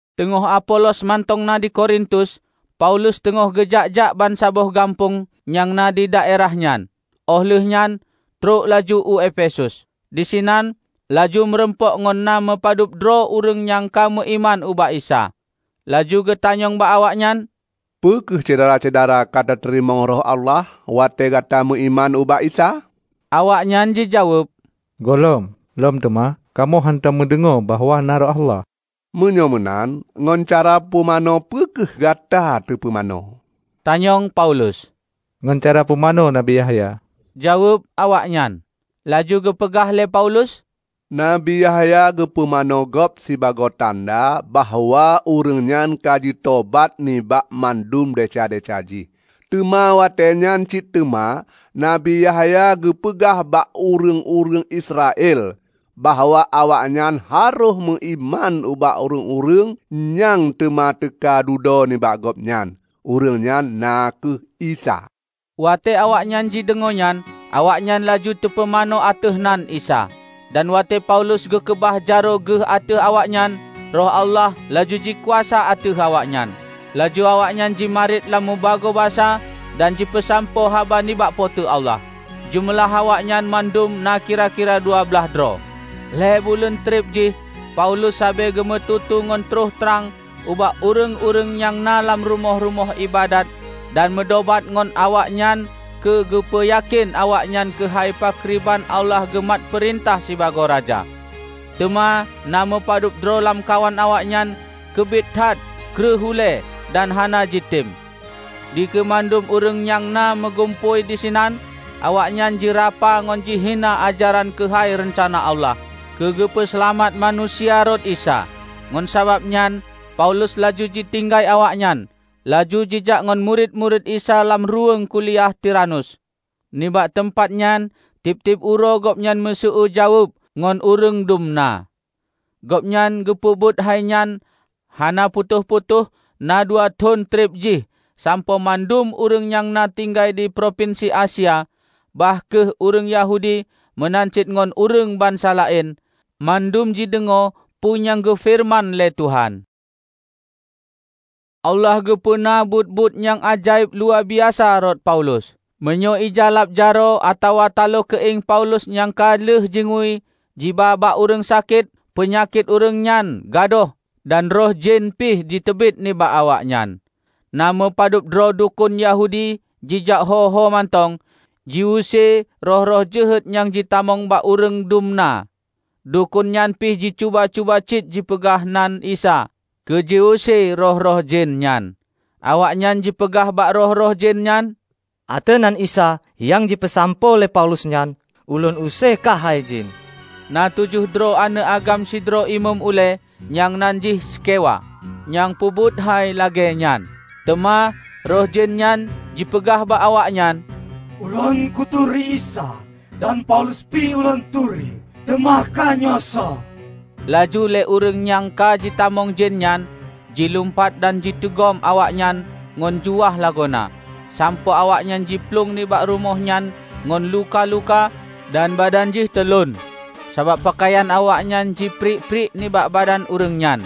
Teungoh Apolos mantong na di Korintus, Paulus teungoh geujak-jak bansaboh gampông nyang na didaerah nyan óh lheueh nyan trok laju u Efesus. Disinan laju meurumpok ngon na meupadubdroe ureuëng nyang ka meuiman ubak Isa. Laju geutanyong bak awaknyan, "Peu kheueh syedara-syedara ka tateurimong Roh Allah watée gata meuiman ubak Isa?" Awaknyan jijaweueb, "Gohlom. Lom teuma, kamoe hántom meudeungoe bahwa na Roh Allah." "Meunyoe meunan, ngon cara pumanö peu kheueh gata teupeumanö?" tanyong Paulus. "Ngon cara pumanö Nabi Yahya," jaweueb awaknyan. Laju geupeugah lé Paulus, "Nabi Yahya geupumanö gob sibagoe tanda bahwa ureuëng nyan ka jitobat nibak mandum desya-desya jih. Teuma watée nyan cit teuma Nabi Yahya geupeugah bak ureuëng-ureuëng Israel bahwa awaknyan harôh meuiman ubak ureuëng nyang teuma teuka dudoe nibak gobnyan, ureuëng nyan na kheueh Isa." Watée awaknyan jideungoe nyan, awaknyan laju teupumanö ateueh nan Isa. Dan watée Paulus geukeubah jaroe geuh ateueh awaknyan, Roh Allah laju jikuasa ateueh awaknyan, laju awaknyan jimarit lam mubagoe basa dan jipeusampoe haba nibak Po teu Allah. Jeumeulah awaknyan mandum na kira-kira dua blaih droe. Lhée buleuen treub jih Paulus sabe geumeututoe ngon trok trang ubak ureuëng-ureuëng nyang na lam rumoh-rumoh iébadat dan meudobat ngon awaknyan keu geupeuyakén awaknyan keuhai pakriban Allah geumat peurintah sibagoe Raja. Teuma na meupadubdroe lamkawan awaknyan keubiet that kreueh ulée dan hana jitem. Dikeue mandum ureuëng nyang na meugumpôi disinan awaknyan jirapa ngon jihina ajaran keuhai reuncana Allah keu geupeu seulamat manusia rot Isa. Ngon sababnyan Paulus laju jitinggai awaknyan, laju jijak ngon murit-murit Isa lam ruweueng kuliah Tiranus. Nibak teumpat nyan tieb-tieb uroe gobnyan meusueue jaweueb ngon ureuëng dum na. Gobnyan geupeubuet hainyan hana putôh-putôh na dua thon treb jih sampoe mandum ureuëng nyang na tinggai di propinsi Asia, bah kheueh ureuëng Yahudi meunan cit ngon ureuëng bansa laén, mandum jideungoe peue nyang geufeureuman lé Tuhan. Allah geupeuna buet-buet nyang ajaéb luwabiasa rot Paulus. Meunyoe ija lab jaroe atawa talo keuieng Paulus nyang ka lheueh jingui jiba bak ureuëng sakét, peunyakét ureuëng nyan gadôh dan roh jén pih jiteubiet nibak awaknyan. Na meupadubdroe dukon Yahudi jijak ho-homantong, jiuse roh-roh jeuhet nyang jitamong bak ureuëng dum na. Dukon nyan pih jicuba-cuba cit jipeuguna nan Isa keu jiuse roh-roh jén nyan. Awaknyan jipeugah bak roh-roh jén nyan, "Ateueh nan Isa nyang jipeusampoe lé Paulus nyan, ulôn use kah hai jén!" Na tujoh droe aneuëk agam sidroe imeum ulée, nyang nan jih Skewa, nyang peubuet hai lagée nyan. Teuma roh jén nyan jipeugah bak awaknyan, "Ulôn kuturi Isa dan Paulus pih ulôn turi, teuma kahnyoe soe?" Laju lé ureuëng nyang ka jitamong jén nyan jilumpat dan jiteugom awaknyan ngon juah lagoena sampoe awaknyan jiplueng nibak rumoh nyan ngon luka-luka dan badan jih teulon, sabab peukayan awaknyan jipriek-priek nibak badan ureuëng nyan.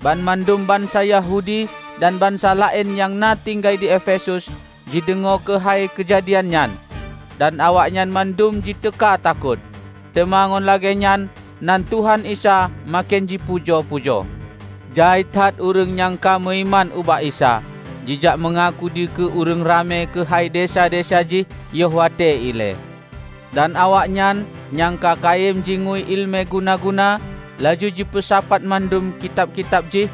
Banmandum bansa Yahudi dan bansa laén nyang na tinggai di Efesus jideungoe keuhai keujadian nyan, dan awaknyan mandum jiteuka takot. Teuma ngon lagée nyan nan Tuhan Isa maken jipujoe-pujoe. Jai that ureuëng nyang ka meuiman ubak Isa, jijak meungaku dikeue ureuëng ramé keuhai desya-desya jih yoh watée ilée. Dan awaknyan nyang ka kayém jingui iéleumé guna-guna, laju jipeusapat mandum kitab-kitab jih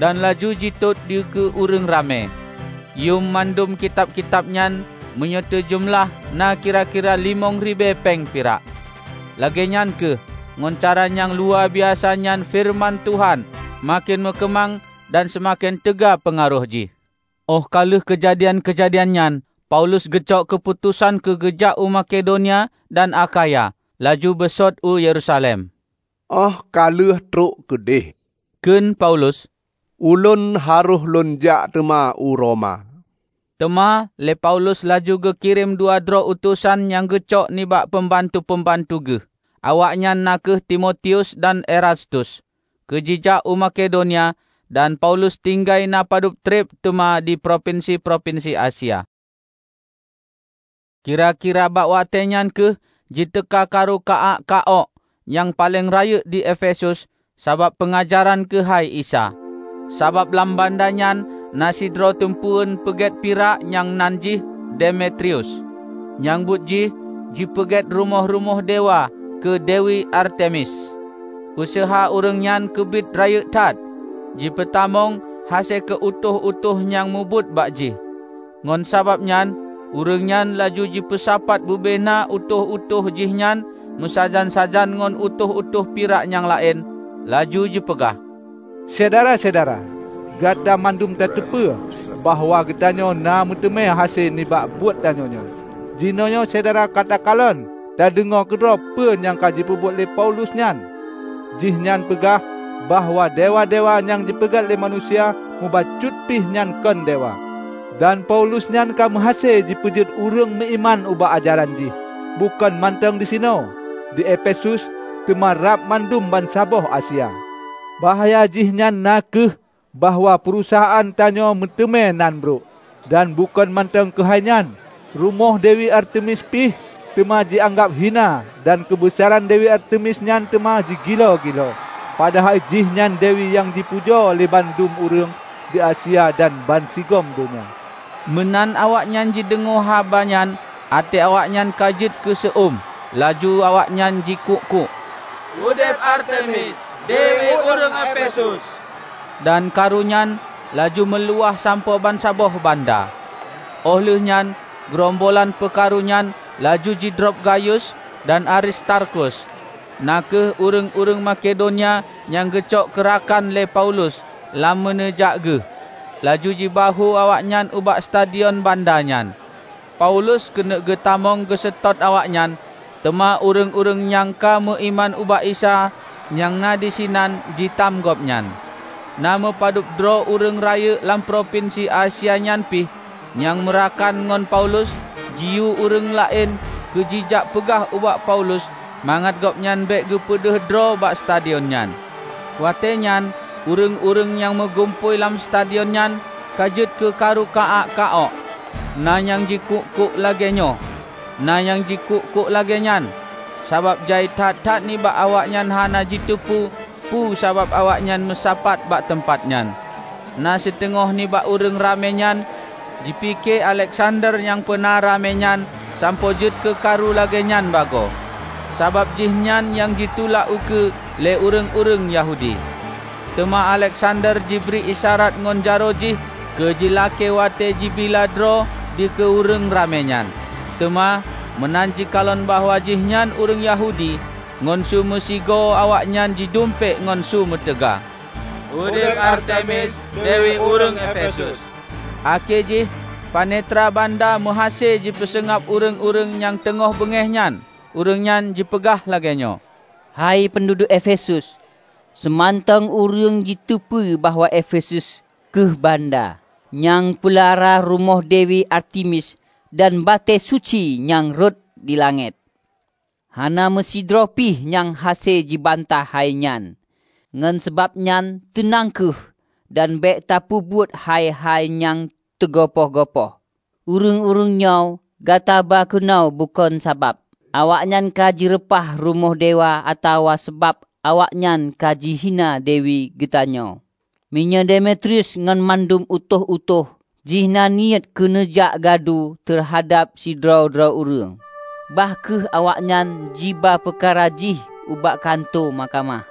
dan laju jitot dikeue ureuëng ramé. Yuem mandum kitab-kitab nyan meunyoe teujeumeulah na kira-kira limong ribée péng pirak. Lagée nyan kheueh, ngon cara nyang luwabiasa nyan feureuman Tuhan maken meukeumang dan seumaken teuga peungaroh jih. Óh ka lheueh keujadian-keujadian nyan, Paulus geucok keuputosan keu geujak u Makedonia dan Akhaya laju beusôt u Yerusalem. "Óh ka lheueh trok keudeh," kheun Paulus, "ulôn harôh lôn jak teuma u Roma." Teuma lé Paulus laju geukirém dua droe utosan nyang geucok nibak peumbantu-peumbantu geuh, awaknyan na kheueh Timotius dan Erastus keu jijak u Makedonia, dan Paulus tinggai na padub treb teuma di propinsi-propinsi Asia. Kira-kira bak watée nyan kheueh jiteuka karu ka-ak, ka-ok, nyang paleng rayeuk di Efesus sabab peungajaran keuhai Isa. Sabab lam banda nyan na sidroe teumpeuen peuget pirak nyang nan jih Demetrius, nyang buet jih jipeugét rumoh-rumoh dewa keu Dewi Artemis. Useuha ureuëng nyan keubiet rayeuk that jipeutamong hase keu utôh-utôh nyang mubuet bak jih. Ngon sabab nyan ureuëng nyan laju jipeusapat bubena utôh-utôh jihnyan meusajan-sajan ngon utôh-utôh pirak nyang laén, laju jipeugah, "Syedara-syedara! Gata mandum tateupeue bahwa geutanyoe na meuteumé hase nibak buet tanyoe nyoe. Jinoenyoe syedara ka takalon tadeungoe keudroe peue nyang jipeubuet lé Paulus nyan. Jihnyan jipeugah bahwa dewa-dewa nyang teupeugét lé manusia mubacut pih nyan kon dewa. Dan Paulus nyan ka meuhase jipeujeuet ureuëng meuiman ubak ajaran jih, bukon mantong disinoe, di Efesus, teuma rab mandum bansaboh Asia. Bahya jih na kheueh bahwa peurusahaan tanyoenyoe meuteumé nan brok. Dan bukon mantong keuhai nyan, rumoh Dewi Artemis pih teuma jianggab hina dan keubeusaran Dewi Artemis nyan teuma jigiloe-giloe; padahai jihnyan dewi nyang teupujoe lé mandum ureuëng di Asia dan bansigom donya!" Meunan awaknyan jideungoe haba nyan até awaknyan ka jeuet keuseu-uem, laju awaknyan jikuk-kuk, "Udeb Artemis, dewi ureuëng Efesus!" Dan karu nyan laju meuluwah sampoe bansaboh banda. Óh lheueh nyan geurombolan peukarunyan laju jidrob Gayus dan Aristarkus, na kheueh ureuëng-ureuëng Makedonia nyang geucok keurakan lé Paulus lam meuneujak geuh, laju jibahue awaknyan ubak stadion banda nyan. Paulus keuneuk geutamong geuseutôt awaknyan, teuma ureuëng-ureuëng nyang ka meuiman ubak Isa nyang na disinan jitam gobnyan. Na meupadubdroe ureuëng rayeuk lam propinsi Asia nyan pih, nyang meurakan ngon Paulus, jiyue ureuëng laén keu jijak peugah ubak Paulus mangat gobnyan bék geupeudeuh droe bak stadion nyan. Watéenyan ureuëng-ureuëng nyang meugumpôi lam stadion nyan ka jeuet keukaru ka-ak ka-ok. Na nyang jikuk-kuk lagéenyoe, na nyang jikuk-kuk lagée nyan, sabab jai that-that nibak awaknyan hana jiteupeue peue sabab awaknyan meusapat bak teumpat nyan. Na siteungoh nibak ureuëng ramé nyan jipike Aleksander nyang peuna ramé nyan sampoe jeuet keukaru lagée nyan bagoe, sabab jihnyan nyang jitulak ukeue lé ureuëng-ureuëng Yahudi. Teuma Aleksander jibri isyarat ngon jaroe jih keu jilakée watée jibila droe dikeue ureuëng ramé nyan. Teuma meunan jikalon bahwa jihnyan ureuëng Yahudi, ngon su meusigoe awaknyan jidumpék ngon su meutaga, "Udeb Artemis, dewi ureuëng Efesus!" Akhé jih panetra banda meuhase jipeuseungab ureuëng-ureuëng nyang teungoh beungéh nyan, ureuëng nyan jipeugah lagée nyoe, "Hai peunduduek Efesus! Soemantong ureuëng jiteupeu bahwa Efesus kheueh banda nyang peulara rumoh Dewi Artemis dan batée suci nyang rhot di langét. Hana meusidroe pih nyang hase jibantah hai nyan. Ngon sabab nyan teunang kheueh dan bék tapeubuet hai-hai nyang teugopoh-gopoh. Ureuëng-ureuëng nyoe, gataba keunoe bukon sabab awaknyan ka jireupah rumoh dewa atawa sabab awaknyan ka jihina dewi geutanyoe. Meunyoe Demetrius ngon mandum utôh-utôh jih na niet keuneuk jak gadu teuhadab sidroe-droe ureuëng, bah kheueh awaknyan jiba peukara jih ubak kantô mahkamah.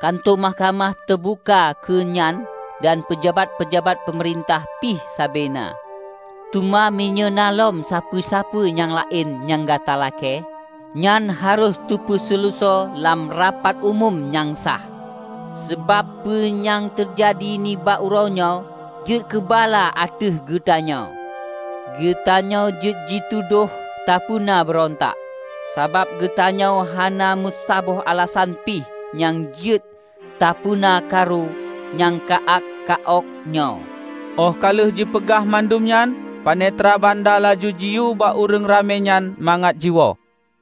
Kantô mahkamah teubuka keu nyan dan peujabat-peujabat peumeurintah pih sabe na. Teuma meunyoe na lom sapeue-sapeue nyang laén nyang gata lakée, nyan harôh teupeuseuleusoe lam rapat umum nyang sah. Sabab peue nyang teujadi nibak uroenyoe jeuet keubala ateueh geutanyoe. Geutanyoe jeuet jitudôh tapeuna beurontak, sabab geutanyoe hana meusaboh alasan pih nyang jeuet tapeubeuna karu nyang ka-ak, ka-ok nyoe." Óh ka lheueh jipeugah mandum nyan, panetra banda laju jiyue bak ureuëng raményan mangat jiwoe.